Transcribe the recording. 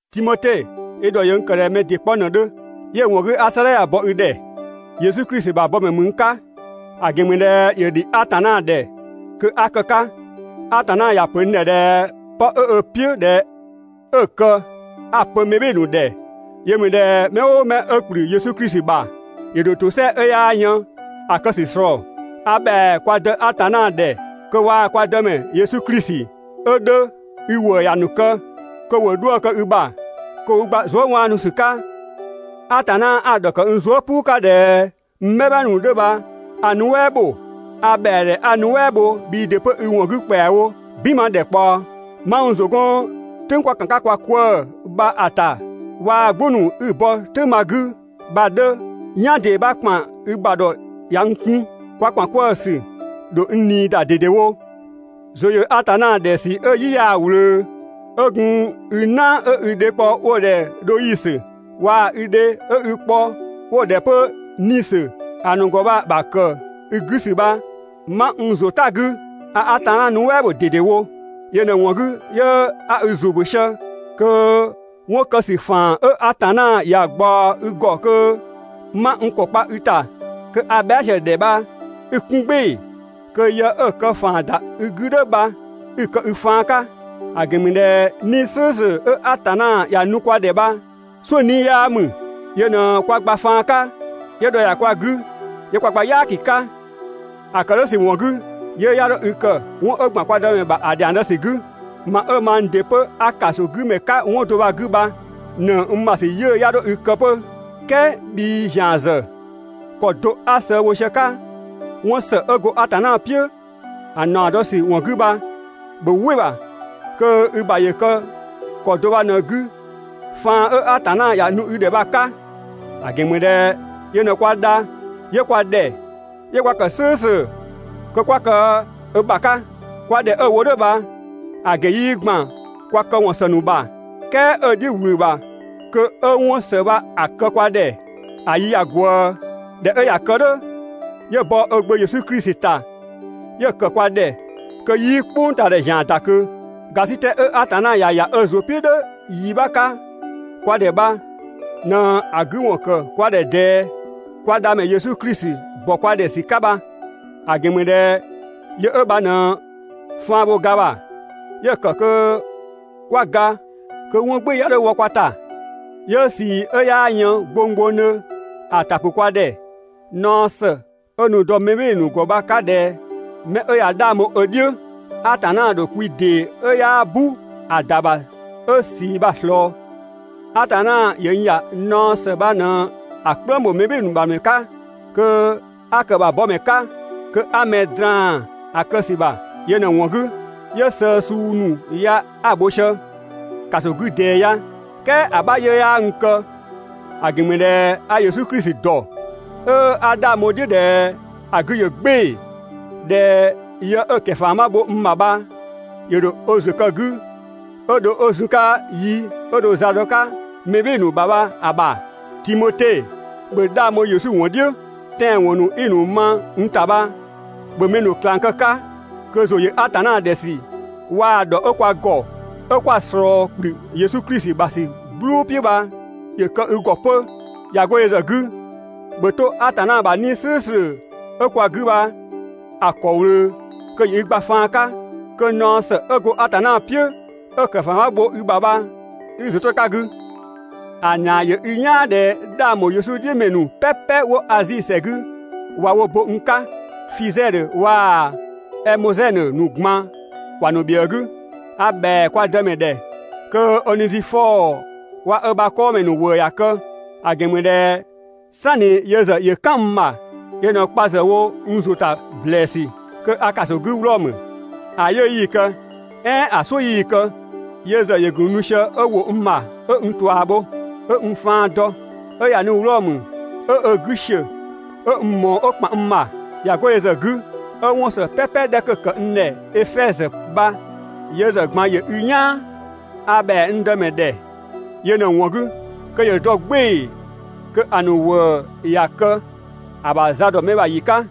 Timote, i ‑dhɔ ‑yö n ‑kë ꞊dhɛ mɛ ‑dɩ 'kpɔ ꞊në‑ 'dhö. 'Yö‑ ‑wɔn 'gü 'a 'sëëdhɛ ya‑ bɔ i ‑dhɛ. Yesu Klisi ‑bha bɔmɛ ‑mü n 'ka, ‑a ‑gɛn ‑mü ꞊dhɛ ‑yö ‑dhi Atanna ‑dhɛ kö 'a kë‑ 'ka. Atanna ‑ya pö n ‑dhɛ ꞊dhɛ 'pë 'ö ö "piʋ̈ ꞊dhɛ 'ö‑ kë 'a‑ pö mɛ "bhɩɩ‑ ‑nu ‑dhɛ. Yö ‑mü ꞊dhɛ mɛ "ʋʋ mɛ 'ö ‑kplü Yesu Klisi ‑bha, ‑yö ‑dho ‑tosɛa 'ö 'yaa yën ‑a kë ‑sü ꞊slɔɔ. A ‑bhɛa kwa Dë Atanna ‑dhɛ kö waa‑ kwa Dëmɛ Yesu Klisi 'ö 'dhö i ‑wëë ‑ya ‑nu kë, kö ‑wo 'dhuë‑ ‑kë i ‑bha, kö ‑wo i gba zuëwaanusü 'ka. Atanna 'a‑ ‑dhɔkë n zuë" "puu 'ka ꞊dhɛ n "bhɛma ‑nu 'dhö bha a‑ nuɛ" ‑bho, a ‑bhɛa ‑dhɛ 'a‑ nuɛ" bho bhii ‑dɩ 'pö i ‑wɔn 'gü ‑kpɛawo "binma ‑dhɛkpaɔ. 'Ma n ‑zʋ 'gɔn "tʋ̈ng 'kwa ‑kan 'ka kwa 'kwëë‑ bha‑ ‑ta waa‑ "gbʋ ‑nu 'i‑ bɔ "tʋ̈ng bha‑ 'gü bha‑ 'dhö, "yan ‑dee 'bha ‑kpan i ‑bha ‑dhɔ ꞊ya n 'kun. Kwa ‑kpan 'kwëë‑ ‑sü ‑dho n ꞊nii ‑da ꞊dedewo. ‑Zʋ ‑yö Atanna ‑dhɛ ‑sü 'ö‑ "yi 'yaa‑ ꞊wlöö, 'ö gun i "na 'ö i dhe kpɔ 'wo‑ ‑dhɛ Dhoisö, waa‑ i dhe 'ö i kpɔ 'wo‑ ‑dhɛ 'pö Nisö ‑a ‑nu ‑gɔ bha‑ ‑bha ‑kë i ‑gɔ ‑sü bha, 'ma n ‑zʋ "ta‑ 'gü, a Atanna nuɛ" ‑bho ꞊dedewo. Yö ꞊në‑ ‑wɔn 'gü 'yö 'a i ‑zʋ ‑bö sië kö 'wɔn kë ‑sü ‑faan 'ö Atanna ‑ya ꞊gbaɔ i ‑gɔ kö 'ma n ‑kɔ kpa i ‑ta kö a bhɛa" sië‑ ‑dhɛ bha 'i‑ 'kun "gbɩɩ‑, kö yë 'ö‑ kë ‑faan ‑da i 'gü "dhʋ̈ bha 'i‑ kë i faan 'ka. ‑A ‑gɛn ‑mü ꞊dhɛ 'Nii‑ "slʋ̈ʋ̈slʋ̈ 'ö Atanna ‑ya nu kwa ‑dhɛ bha, "suʋ̈ 'nii‑ 'yaa ‑mü, yö ꞊në kwa gba faan 'ka, 'yö ‑dhɔ ‑ya kwa 'gü, 'yö kwa gba "yaaki 'ka. ‑A ‑kë "dhʋ̈ ‑sü ‑wɔn 'gü, 'yiʋ̈‑ 'ya 'dho i kë 'wɔn 'ö ‑gban kwa Dëmɛ ‑bha ‑a ‑dhiang zë ‑sü 'gü. Ma 'ö mang ‑dɩ 'pö 'a ‑kasogümɛ 'ka 'wɔn do bha‑ 'gü bha, ‑nëng n ‑bha ‑sü 'yiʋ̈‑ 'ya 'dho i kë 'pö. "Kɛɛ bhii ‑zian ‑zë, ‑kɔ do 'a sëë bho sië‑ 'ka 'wɔn ‑së 'ö go Atanna "piʋ̈‑ ‑naɔ dɔ ‑sü ‑wɔn 'gü bha, ‑bhö "wɩ‑ ‑bha kö i ‑bha ‑yö kë ‑kɔ do bha ꞊në‑ 'gü faan 'ö Atanna ‑ya nu i ‑dhɛ bha‑ 'ka. ‑A ‑gɛn ‑mü ꞊dhɛ yö ꞊në kwa dha, 'yö kwa ‑dhɛ, 'yö kwa ‑kë "slʋ̈ʋ̈slʋ̈ kö 'kwa kë ö ‑bha 'ka. Kwa ‑dhɛ 'ö‑ wo "dhʋ̈ bha‑ ‑gɛn 'yii ‑gban kwa këwɔn ‑së ‑nu ‑bha, "kɛɛ 'ö‑ "dhiʋ̈ ꞊wlü‑ ‑bha kö 'ö 'wɔn ‑së bha‑ kë kwa ‑dhɛ ‑a yi ꞊ya ꞊gwëë, ꞊dhɛ 'ö ꞊ya kë "dhʋ̈, 'yö bɔ ö Gbö Yesu Klisi ‑ta 'yö‑ ‑kë kwa ‑dhɛ kö 'yii "kpʋngtaadhɛ ‑zian ‑da ꞊kö. ‑Gasitɛ 'ö Atanna ‑ya ‑ya ö ‑zʋ "piʋ̈ "dhʋ̈ yi 'bha 'ka kwa ‑dhɛ bha ꞊në 'ö‑ 'gü ‑wɔn ‑kë ꞊dɛɛ kwa Dhamɛ Yesu Klisi ‑bɔ kwa ‑dhɛ ‑sü 'ka bha. ‑A ‑gɛn ‑mü ꞊dhɛ yö 'ö bha ꞊në faan bho ga ‑bha. 'Yö‑ ‑kë kö 'kwa ga kö 'wɔn "gbɩɩ‑ 'ya 'dho wɔ kwa ‑ta. 'Yö ꞊sii 'ö 'yaa yën gbonggbongdhö ‑a ‑ta ‑pʋ kwa ‑dhɛ naɔ ‑së 'ö nu‑ dɔ mɛ "bhɩɩ‑ ‑nu ‑gɔ bha‑ 'ka ꞊dhɛ ('mɛ 'ö ꞊ya 'dhang bho ö "dhiʋ̈), Atanna ‑dho kwi ‑dee 'ö 'yaa "bu ‑a ‑da ‑bha 'ö ꞊sii bha‑ ꞊slɔɔ. Atanna ‑yö n ‑ya naɔ ‑së bha ꞊në‑ "kplëng ‑bho mɛ "bhɩɩ‑ ‑nu ‑dhɛ ‑mɛ 'ka kö 'a kë‑ ‑bha bɔmɛ 'ka, kö 'a mɛ draan‑ kë ‑sü ‑bha. Yö ꞊në‑ ‑wɔn 'gü 'yö sëë suu ‑nu ya 'a‑ bho sië (‑kaso 'gü ꞊dɛɛ ya). "Kɛɛ ‑a 'bha 'yiʋ̈‑ 'yaa n kë, ‑a ‑gɛn ‑mü ꞊dhɛ a Yesu Klisi dɔ, 'ö 'a 'dhang bho‑ "dhiʋ̈ ꞊dhɛ ‑a 'gü ‑yö "gbɩɩ‑, ꞊dhɛ yë 'ö‑ ‑kɛfama bho n ‑bha bha ‑yö ‑dho ö ‑zʋ kë‑ 'gü 'ö dho 'ö zun‑ 'ka yi 'ö dho za dɔ‑ 'ka mɛ "bhɩɩ‑ ‑nu ‑bha bha‑ ‑bha. (Timote,) ‑bhö 'dhang bho Yesu ‑wɔn "dhiʋ̈! Tɛanwɔn ‑nu 'i‑ ma n ‑ta bha ‑bhö mɛ ‑nu ꞊klang kë‑ 'ka, kö ‑zʋ ‑yö Atanna ‑dhɛ ‑sü waa‑ ‑dhɔ 'ö kwa ‑gɔ, 'ö 'kwa‑ ꞊slɔɔ ‑kplü Yesu Klisi ‑bha ‑sü "gblʋʋ "piʋ̈ bha ‑yö kë i ‑gɔ 'pö. ꞊Ya 'go yö ‑zë 'gü, ‑bhö 'to Atanna ‑bha 'Nii‑ "slʋ̈ʋ̈slʋ̈ 'ö kwa 'gü bha‑ ‑kɔ ꞊wlöö kö ‑yö i gba faan 'ka, kö naɔ ‑së 'ö go Atanna "piʋ̈ 'ö‑ ‑kɛfama bho i ‑bha bha 'i i ‑zʋ 'to‑ 'ka ‑a 'gü. ‑A ‑naa ‑yö i "yaan ꞊dhɛ 'dhang ‑bho Yesu "dhiʋ̈ ‑mɛ ‑nu "pɛpɛ 'wo Azi ‑sɛ 'gü ꞊wa wo bo n 'ka. Fizɛdhö waa‑ Ɛmozɛnö ‑nu ꞊gban ‑wa ‑nu ‑bhiëë 'gü. A ‑bhɛa kwa Dëmɛ ‑dhɛ kö Onezifɔɔ waa‑ ö ‑bha 'kɔɔmɛ ‑nu ‑wëë ‑ya kë. ‑A ‑gɛn ‑mü ꞊dhɛ ("sanni yö ‑zë ‑yö "kan n ‑bha), yö ꞊në kpa ‑zë wo n ‑zʋ ‑ta ‑blɛɛsü kö a ‑kaso 'gü Wlɔmö, ‑a 'yiʋ̈‑ 'yii‑ kë "ɛɛn ‑a "suʋ̈ 'yii‑ kë, yö ‑zë ‑yö ‑gun nu sië 'ö ‑wo n ‑bha 'ö n ꞊tua bho, 'ö n faan dɔ, 'ö ꞊ya nu Wlɔmö, 'ö ö 'gü ‑siö 'ö n ꞊mɔɔ 'ö ‑kpan n ‑bha. ꞊Ya 'go yö ‑zë 'gü, 'ö 'wɔn ‑së "pɛpɛ 'dhɛ 'kö‑ ‑kë n ‑dhɛ Efɛzö bha yö ‑zë ꞊gban ‑yö i "yaan. A ‑bhɛa n Dëmɛ ‑dhɛ yö ꞊në‑ ‑wɔn 'gü kö ‑yö dɔ "gbɩɩ‑ kö ‑a ‑nu ‑wëë ‑ya kë ‑a ‑bha za ‑dɔ mɛ ‑bha ‑yi 'ka.